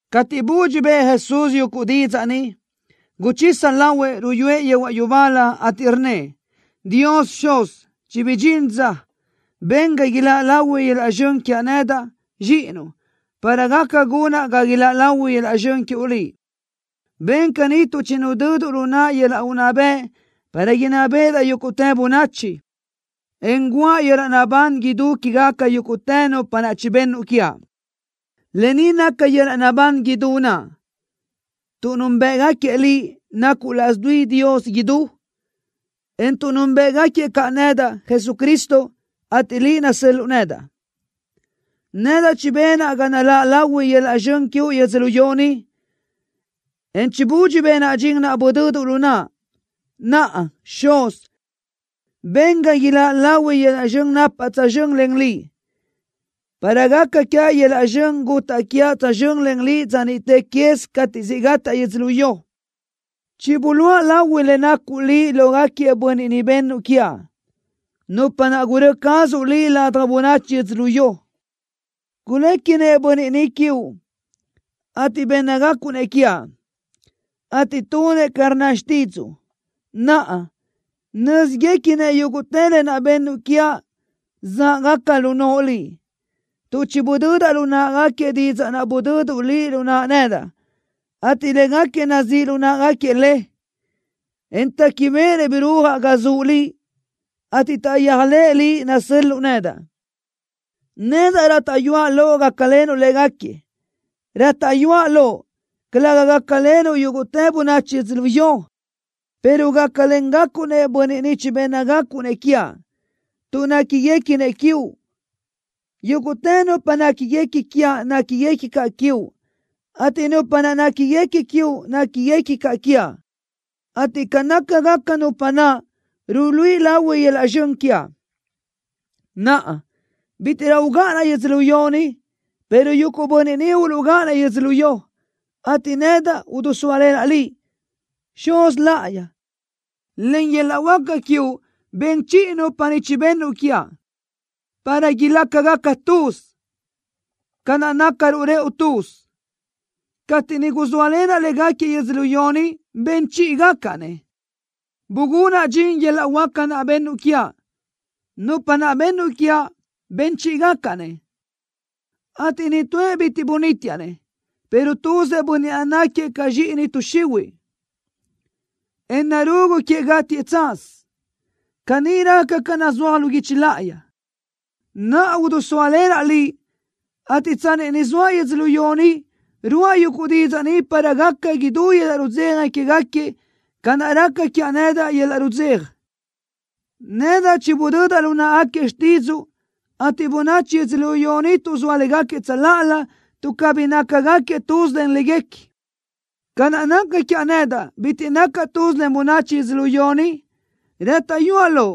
Cateʼ budxi bëʼë Jesús yuguʼ didzaʼ ni, guchisa lahuëʼ, ruyúëʼ yehuaʼ yubálö, ateʼ rnnëʼ: —Dios Xuz, chibidxín dza. Ben ga iláʼ lahui yöl-laʼ zxön quiaʼ nedaʼ, Zxíʼinuʼ, para gaca gunaʼ ga iláʼ lahui yöl-laʼ zxön quiuʼ Liʼ. Ben caní tuʼ chinudöduʼ lu naʼa yöl-laʼ unná bëʼ para inná béʼedaʼ yúguʼtë bönachi, en guʼa yöl-laʼ naʼbán idú quégaca yúguʼtë nupa naʼ chibennuʼ quiaʼ. Lë ni naca yöl-laʼ naʼbán idú naʼ, tuʼ núnbëʼgaquiëʼ Liʼ, nacuʼ laʼs dui Dios idú, en tuʼ núnbëʼgaquiëʼ caʼ nedaʼ, Jesucristo, ateʼ Liʼ nasö́l-luʼu nedaʼ. ’Nedaʼ chibenaʼ ga naláʼ lahui yöl-laʼ zxön quiuʼ yödzölió ni, en chibudxi benaʼ dxin naʼ budöduʼ lu naʼa. Naʼa, Xuz, ben ga iláʼ lahui yöl-laʼ zxön napaʼ tsözxö́n len Liʼ, para gaca quiaʼ yöl-laʼ zxön gutaʼ quiaʼ tsözxö́n len Liʼ dza niʼte quez cateʼ siʼ gataʼ yödzölió. ’Chibuluʼa lahui le nacuʼ Liʼ lógaquiëʼ bönniʼ ni bennuʼ quiaʼ, nupa naʼ gurö́ cazuʼ Liʼ ladaj bönachi yödzölió. Guléquinëʼ bönniʼ ni quiuʼ, ateʼ bénnagacuʼ-nëʼ quiaʼ, ateʼ tunëʼ ca rnna xtídzuʼu. Naʼa nö́zguequinëʼ yúguʼtë lë naʼ bennuʼ quiaʼ záʼgaca lu noʼo Liʼ, tuʼ chibudödaʼ lu náʼagaquiëʼ didzaʼ naʼ budöduʼ Liʼ lu naʼa nedaʼ, ateʼ légaquiëʼ nazíʼ lu náʼagaquiëʼ le, en téquibeʼenëʼ birúajaʼ ga zuʼ Liʼ, ateʼ taʼyéajlëʼë Liʼ nasö́l-luʼu nedaʼ. ’Nedaʼ rátaʼyuaʼ Loʼ gácalenuʼ légaquiëʼ. Rátaʼyuaʼ Loʼ, calëga gácalenuʼ yúguʼtë bönachi yödzölió, pero gácalengacuʼ-nëʼ bönniʼ ni chibénnagacuʼ-nëʼ quiaʼ, tuʼ néquiguequinëʼ quiuʼ. Yúguʼtë nupa néquiguequi quiaʼ néquiguequi caʼ quiuʼ, ateʼ nupa naʼ néquiguequi quiuʼ néquiguequi caʼ quiaʼ, ateʼ ca nácagaca nupa naʼ ruluíʼi lahui yöl-laʼ zxön quiaʼ. ’Naʼa, bítiʼrö ugáʼanaʼ yödzölió ni, pero yuguʼ bönniʼ ni uluʼgáʼanëʼ yödzölió, ateʼ nedaʼ udusóalenaʼ Liʼ. Xuz Láʼayi, len yöl-laʼ huáca quiuʼ ben chiʼi nupa ni chibennuʼ quiaʼ, para ilácagaca tuz, ca naʼ nácaruʼ rëʼu tuz. Cateʼ niʼ guzóalenaʼ légaquiëʼ yödzölió ni, ben chíʼigacaʼ-nëʼ, bugunaʼ dxin yöl-laʼ huáca naʼ bennuʼ quiaʼ. Nupa naʼ bennuʼ quiaʼ, ben chíʼigacaʼ-nëʼ, ateʼ nitúëʼ bitiʼ bunítiaʼ-nëʼ, pero tuzëʼ bönniʼ naʼ náquiëʼ ca zxíʼini tuʼ xihuiʼ, en narugu queëʼ gátiëʼ tsaz. Caní raca ca nazúaj lu guichi láʼayi. ’Naʼa udusóalenaʼ Liʼ, ateʼ tsanni ni zoaʼ yödzölió ni, ruáʼa yuguʼ didzaʼ ni para gaca idú yöl-laʼ rudzeja quégaquiëʼ ca naʼ raca quiaʼ nedaʼ yöl-laʼ rudzeja. Nedaʼ chibudödaʼ lu náʼagaquiëʼ xtídzuʼu, ateʼ bönachi yödzölió ni tuʼzóa légaquiëʼ tsöláʼalö tuʼ cabí nácagaquiëʼ tuz len léguequi, ca naʼ naca quiaʼ nedaʼ, bitiʼ nacaʼ tuz len bönachi yödzölió ni. Rátaʼyuaʼ Loʼ,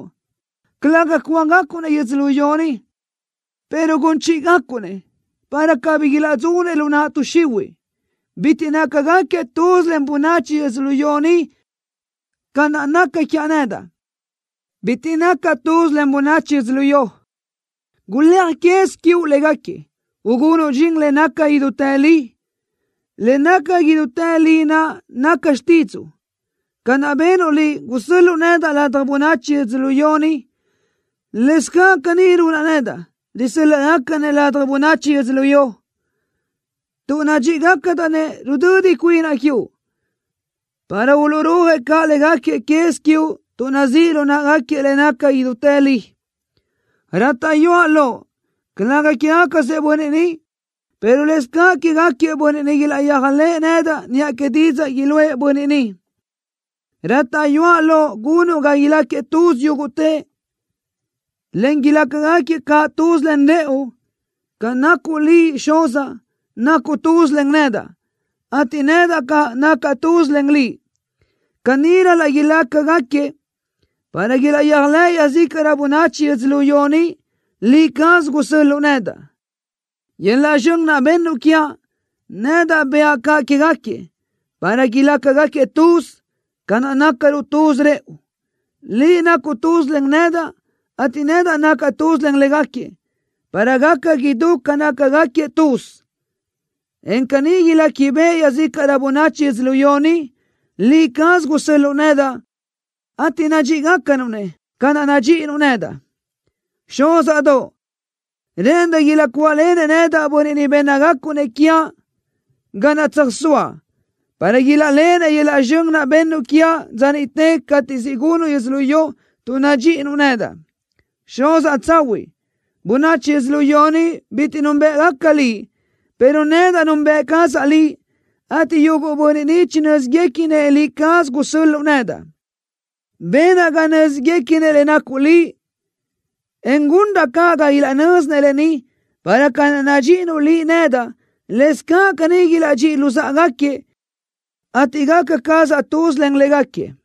calëga cúagacuʼ-nëʼ yödzölió ni, pero gun chíʼigacuʼ-nëʼ, para cabí ilaʼdzunëʼ lu naʼ tuʼ xihuiʼ. Bitiʼ nácagaquiëʼ tuz len bönachi yödzölió ni ca naʼ naca quiaʼ nedaʼ, bitiʼ nacaʼ tuz len bönachi yödzölió. Guléaj quez quiuʼ légaquiëʼ, ugunuʼ dxin le naca idútë li. Le naca idútë li naʼ naca xtídzuʼu. Ca naʼ benuʼ Liʼ, gusö́l-luʼu nedaʼ ladaj bönachi yödzölió ni, lëscaʼ caní runaʼ nedaʼ, risö́l-laʼgacaʼ-nëʼ ladaj bönachi yödzölió. Tuʼ nadxíʼigacadaʼ-nëʼ rudödi cuinaʼ quiuʼ, para uluʼrúajëʼ caʼ légaquiëʼ quez quiuʼ tuʼ nazíʼ lu náʼagaquiëʼ le naca idútë li. ’Rátaʼyuaʼ Loʼ, calëga quégacasëʼ bönniʼ ni, pero lëscaʼ quégaquiëʼ bönniʼ niʼ ilaʼyéajlëʼë nedaʼ niʼa que didzaʼ iluʼë bönniʼ ni. Rátaʼyuaʼ Loʼ gunuʼ ga ilácagaquiëʼ tuz yúguʼtëʼ, en ilácagaquiëʼ caʼ tuz len rëʼu, ca naʼ nacuʼ Liʼ, Xuzaʼ, nacuʼ tuz len nedaʼ, ateʼ nedaʼ caʼ, nacaʼ tuz len Liʼ. Caní ral-laʼ ilácagaquiëʼ para ilaʼyéajlëʼ iaʼzícaʼrö bönachi yödzölió ni, Liʼ caz gusö́l-luʼu nedaʼ. Yöl-laʼ zxön naʼ bennuʼ quiaʼ, nedaʼ bëʼa caʼ quégaquiëʼ, para ilácagaquiëʼ tuz, ca naʼ nácaruʼ tuz rëʼu. Liʼ nacuʼ tuz len nedaʼ, ateʼ nedaʼ nacaʼ tuz len légaquiëʼ, para gaca idú ca nácagaquiëʼ tuz, en caní iléquibeʼe iaʼzícaʼrö bönachi yödzölió ni, Liʼ caz gusö́l-luʼu nedaʼ, ateʼ nadxíʼigacanuʼ-nëʼ ca naʼ nadxíʼinuʼ nedaʼ. ’Xúzaʼdoʼ, rë́ʼëndaʼ ilaʼcuáʼlenëʼ nedaʼ bönniʼ ni bénnagacuʼ-nëʼ quiaʼ ga naʼ tsöjsóaʼ, para ilaʼléʼenëʼ yöl-laʼ zxön naʼ bennuʼ quiaʼ dza niʼte cateʼ siʼ gunuʼ yödzölió tuʼ nadxíʼinuʼ nedaʼ. Xuzaʼ tsahuiʼ, bönachi yödzölió ni bitiʼ núnbëʼgaca Liʼ, pero nedaʼ nunbëʼ cazaʼ Liʼ, ateʼ yuguʼ bönniʼ ni chinö́ziguequinëʼ Liʼ caz gusö́l-luʼu nedaʼ. Benaʼ ga nö́ziguequinëʼ le nacuʼ Liʼ, en gunraʼ caʼ ga ilaʼnö́zinëʼ lë ni para ca naʼ nadxíʼinuʼ Liʼ nedaʼ, lëscaʼ caní ilaʼdxíʼi luzáʼagaquiëʼ, ateʼ gaca cazaʼ tuz len légaquiëʼ.